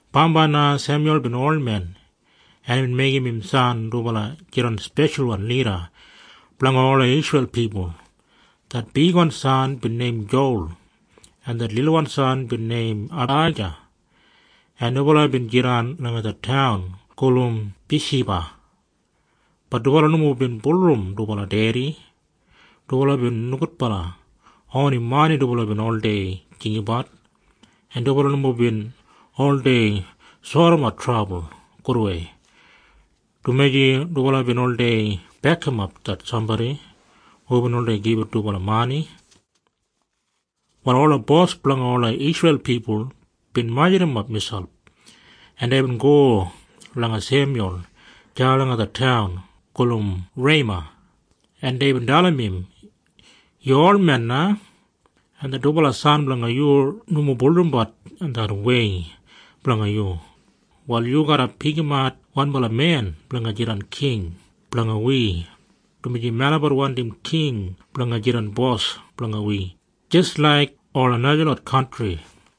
Bambai na Semyul bin olmen, en imbin meigim im san dubala jidan speshalwan lida blanga ola Isreil pipul. Det bigwan san bin neim Jowal, en det lilwan san bin neim Abaija, en dubala bin jidan langa det taun gulum Biyashiba. Bat dubala nomo bin bulurrum dubala dedi. Dubala bin nogudbala. Oni mani dubala bin oldei jinggabat, en dubala nomo bin oldei sodimat trabul gudwei, dumaji dubala bin oldei bekimap det sambodi hubin oldei gibit dubala mani. Wal ola bos blanga ola Isreil pipul bin majurrumap miselp, en deibin go langa Semyul deya langa det taun gulum Rema, en deibin dalim im, “Yu olmen na, en det dubala san blanga yu nomo bulurrumbat det wei blanga yu. Wal yu garra pikimat wanbala men blanga jidan king blanga wi, dumaji melabat wandim king blanga jidan bos blanga wi jis laik ola najalot kantri.”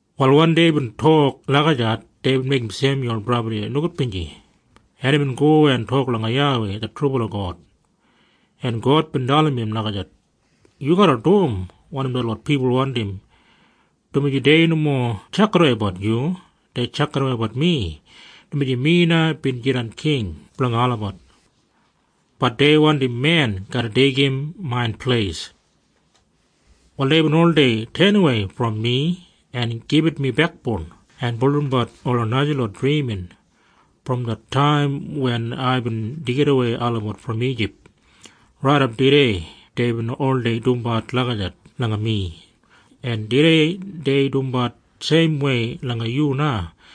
Wal wen deibin tok lagijat, deibin meigim Semyul brabli nogudbinji, en imbin go en tok langa YAWEI det trubala God, en God bin dalim im lagijat, “Yu garra dum wanim detlot pipul wandim, dumaji dei nomo tjakidaweibat yu. Dei tjakidaweibat mi, dumaji mi na bin jidan king blanga olabat. Bat dei wandim men garra deigim main pleis. Wal deibin oldei tenawei brom mi en gibit mi bekboun en bulurrumbat ola najalot drimin. Brom det taim wen aibin deigidawei olabat brom Ijip raidap tudei deibin oldei dumbat lagijat langa mi. En tudei dei dumbat seimwei langa yu na.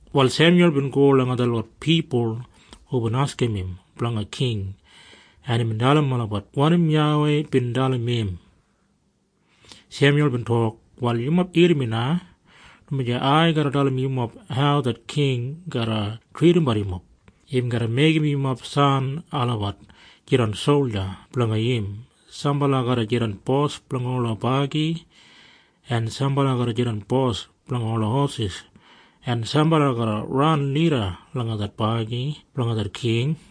Wal Semyul bin go langa detlot pipul hubin askim im blanga king, en imbin dalim olabat wanim YAWEI bin dalim im. Semyul bin tok, “Wal yumob irrim mi na, dumaji ai garra dalim yumob hau det king garra tridimbat yumob. Im garra meigim yumob san olabat jidan solja blanga im. Sambala garra jidan bos blanga ola bagi, en sambala garra jidan bos blanga ola hosis, en sambala garra ran lida langa det bagi blanga det king.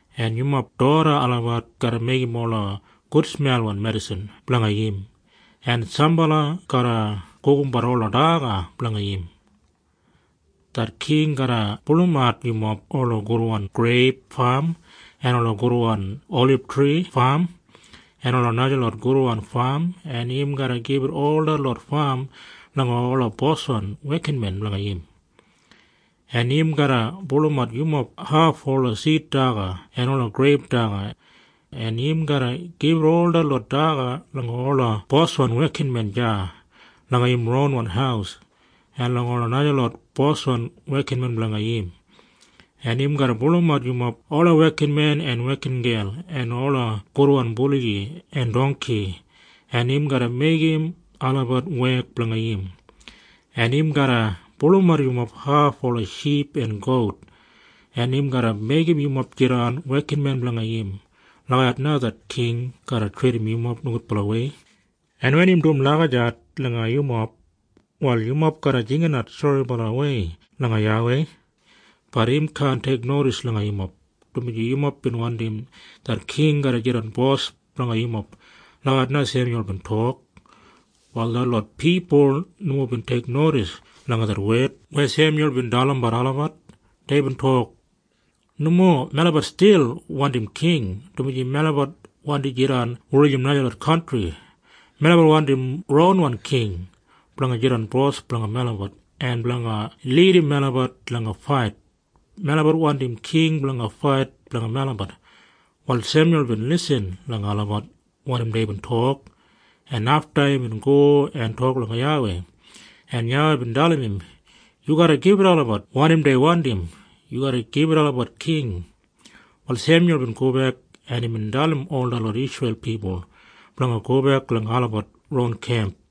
En yumob doda olabat garra meigim ola gudsmelwan medisin blanga im, en sambala garra gugumbat ola daga blanga im. Det king garra pulumat yumob ola gudwan greip fam en ola gudwan olibtri fam en ola najalot gudwan fam, en im garra gibit ol detlot fam langa ola boswan wekinmen blanga im. En im garra pulumat yumob haf ola sid daga en ola greip daga, en im garra gibit ol detlot daga langa ola boswan wekinmen deya langa im ronwan haus en langa ola najalot boswan wekinmen blanga im. En im garra pulumat yumob ola wekinmen en wekingel en ola gudwan buligi en dongki, en im garra meigim olabat wek blanga im, en im garra pulumat yumob haf ola ship en gout, en im garra meigim yumob jidan wekinmen blanga im. Lagijat na det king garra tridim yumob nogudbalawei. En wen im dum lagijat langa yumob, wal yumob garra jinginat soribalawei langa YAWEI. Bat im kaan teiknodis langa yumob, dumaji yumob bin wandim det king garra jidan bos blanga yumob.” Lagijat na Semyul bin tok. Wal detlot pipul nomo bin teiknodis langa det wed weya Semyul bin dalim olabat. Deibin tok, “Nomo. Melabat stil wandim king, dumaji melabat wandi jidan wulijim najalot kantri. Melabat wandim ronwan king blanga jidan bos blanga melabat en blanga lidim melabat langa fait. Melabat wandim king blanga fait blanga melabat.” Wal Semyul bin lisin langa olabat wanim deibin tok, en afta imbin go en tok langa YAWEI, en YAWEI bin dalim im, “Yu garra gibit olabat wanim dei wandim. Yu garra gibit olabat king.” Wal Semyul bin gobek, en imbin dalim ol detlot Isreil pipul blanga gobek langa olabat ron kemp.